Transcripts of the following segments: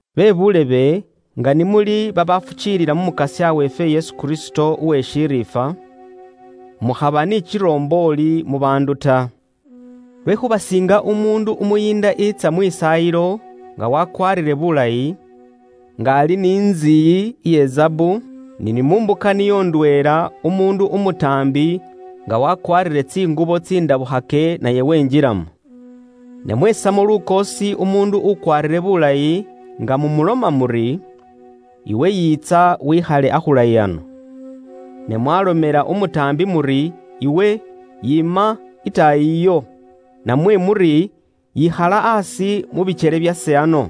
Bebuulebe, nga ni muli babaafukiilila mu Mukasya weefwe Yesu Kristo uwe shiriifwa, mukhaba ni kirombooli mu baandu ta. Lwekhuuba siinga umuundu umuyiinda eetsa muntsu iye khukhwisaayilamo nga wakwaarire bulayi, nga ali ni ntsiyi iye zaabu, ni mu mbuka niyo ndweela, umuundu umutaambi nga wakwaarire tsingubo tsindabukhake naye wenjilamo. Ne mweesamo lukoosi umuundu ukwaarire bulayi nga mumuloma muri, “Iwe yiitsa, wikhale akhulayi ano,” ne mwaalomela umutaambi muri, “Iwe, yiima itaayi iyo,” namwe muri, “Yikhala aasi mu bikyele byase ano,”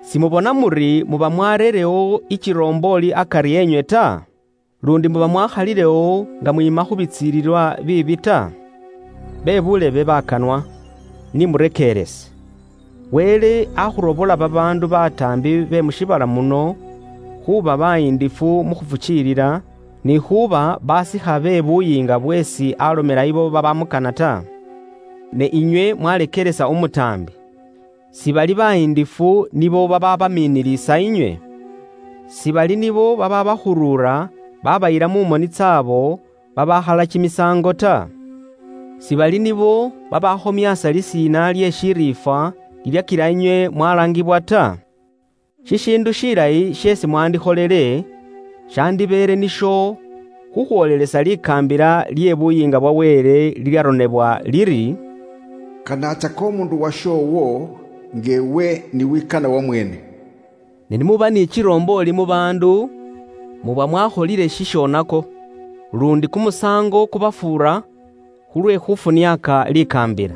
simubona muri muba mwareerewo ikirombooli akari enywe ta? Luundi muba mwaakhalilewo nga mwiima khu bitsilililwa biibi? Bebuulebe bakanwa, ni murekeerese, Wele akhurobola babaandu bataambi be mu shiibala muno, khuuba bayindifu mu khufukiilila, ni khuuba basikha be buyiinga bweesi alomela abo babamukana ta? Ne inywe mwaleekelesa umutaambi. Sibali bayiindifu nibo babaabamiinilisa inywe? Sibali nibo babaabakhurura baabayila mu moni tsaabo babaakhala kimisaango ta? Sibali nibo babaakhomyaasa lisiina lye shiriifwa lilyakila inywe mwalaangibwa ta? Shishiindu shilayi sheesi mwandikholile, shandibeele nisho khukhwoolelesa likaambila lye Buyiinga bwa Wele liliili mu byaronebwa bikhosefu liliiloma liri, “Kanaatsaka umuundu washoowo, nga iwe ni wikana wamweene.” Ne ni muba ni kirombooli mu baandu, muba mwakholile shishonako, luundi kumusaango kubafuura khulwe khufuniaaka likaambila.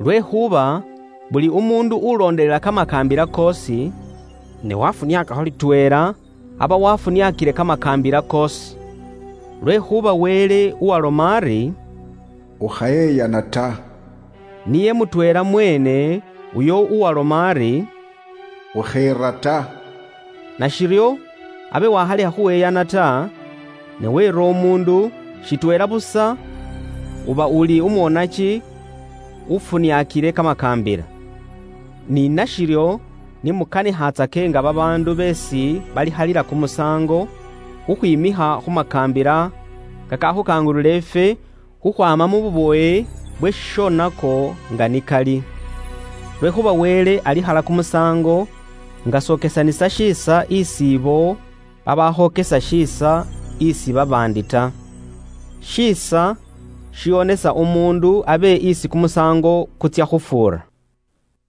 Lwekhuuba buli umuundu ulondelela kamakaambila koosi, ne wafuniaakakho litweela, aba wafuniaakile kamakaambila koosi. Lwekhuuba Wele uwaaloma ari, “Ukhayeyana ta,” niye mutweela mweene uyo uwaaloma ari, “Ukheera ta.” Nashiryo, abe wakhalekha khuyeyana ta, ne weera umuundu, shitweela busa uba uli umwonaki ufuniakile kamakaambila. Ni nashiryo, ni mukanikhatsake nga babaandu beesi balikhalila kumusaango, khukhwiimikha khu makaambila kakakhukangulula ifwe khukhwaama mu bubowe bwe shishonako nga ni kali. Lwekhuuba Wele alikhala kumusaango nga s'okesanisa shiisa isi ibo babaakhokesa shiisa isi babaandi ta. Shiisa shiwonesa umuundu abe isi kumusaango kutsya khufuura.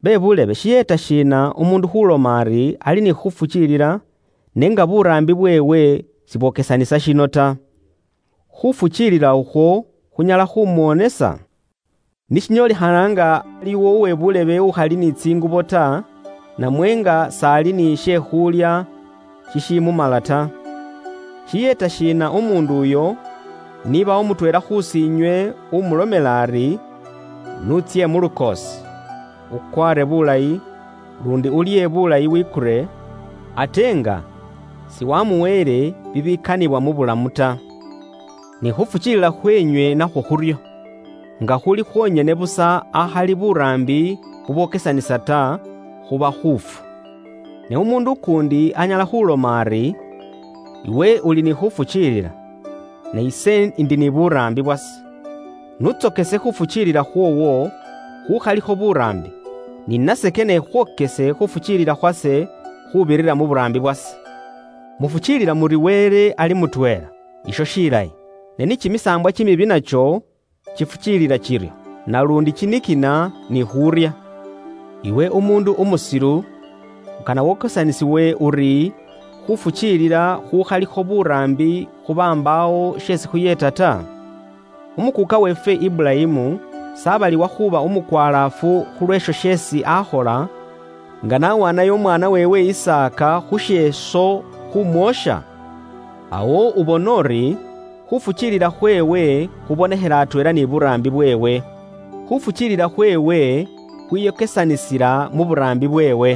Bebuulebe, shiyeeta shiina, umuundu khuloma ari, ali ni khufukiilila, n'enga buraambi bweewe sibwokesanisa shino ta? Khufukiilila ukhwo khunyala khumuwonisa? Ni shinyoolikhana nga iliwo uwe buulebe umusaani namwe umukhasi ukhali ni tsingubo ta, namwe nga s'ali ni she khuulya shishimumala ta, shiyeeta shiina umuundu uyo, nibawo mutweela khusiinywe umulomela ari, “N'utsye mu lukoosi, ukwaare bulayi, luundi ulye bulayi wikure,” ate nga siwamuweele bibikanibwa mu bulamu ta? Ni khufukiilila khweenywe nakhwo khuryo. Nga khuli khwonyene busa akhali buraambi bubwokesanisa, khuba khuufu. Ne umuundu ukuundi anyala khuuloma ari, “Iwe uli ni khuufukiilila, ne ise ndi ni buraambi bwase.” N'untsokese khuufukiilila khwoowo khuukhalikho buraambi, ni nase kane ikhwokese khuufukiilila khwase khuubirira mu buraambi bwase. Mufukiilila muri Wele ali mutweela. Isho shilayi. Ne ni kimisaambwa kimibi nakyo kifukiilila kiryo, naluundi kinikina ni khuurya. Iwe umuundu umusilu, ukana wokesanisiwe uri khuufukiilila khuukhalikho buraambi khuba mbaawo sheesi khuyeeta ta? Umukuuka weefwe Iburayimu s'abaliwa khuuba umukwalaafu khu lweesho sheesi akhola, nga n'awaanayo umwaana weewe Isaaka khu sheeso khumwoosha? Awo ubona uri, khuufukiilila khweewe khubonekhela atweela ni buraambi bweewe. Khuufukiilila khweewe khwiyokesanisila mu buraambi bweewe.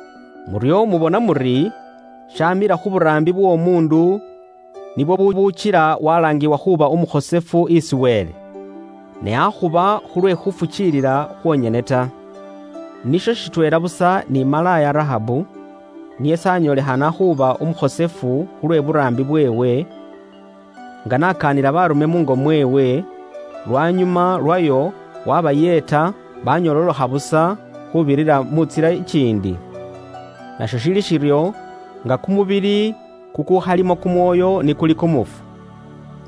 Muryo mubona muri, shaamila khu buraambi bw'omuundu nibwo bubuukila walaangibwa khuuba umukhosefu isi Wele, ne akhuba khulwe khuufukiilila khwonyene ta. Nisho shitweela busa ni malaaya Rahabu. Niye s'anyoolekhana khuuba umukhosefu khulwe buraambi bweewe, nga n'akaanila baarume muungo mweewe, lwanyuma lwayo wabayeeta banyololokha busa khuubirira mu ntsila ikiindi? Nasho shili shiryo; nga kumubili kukukhalimo kumwoyo ni kuli kumufu,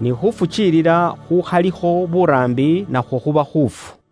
ni khufukiilila khukhalikho buraambi, nakhwo khuba khuufu.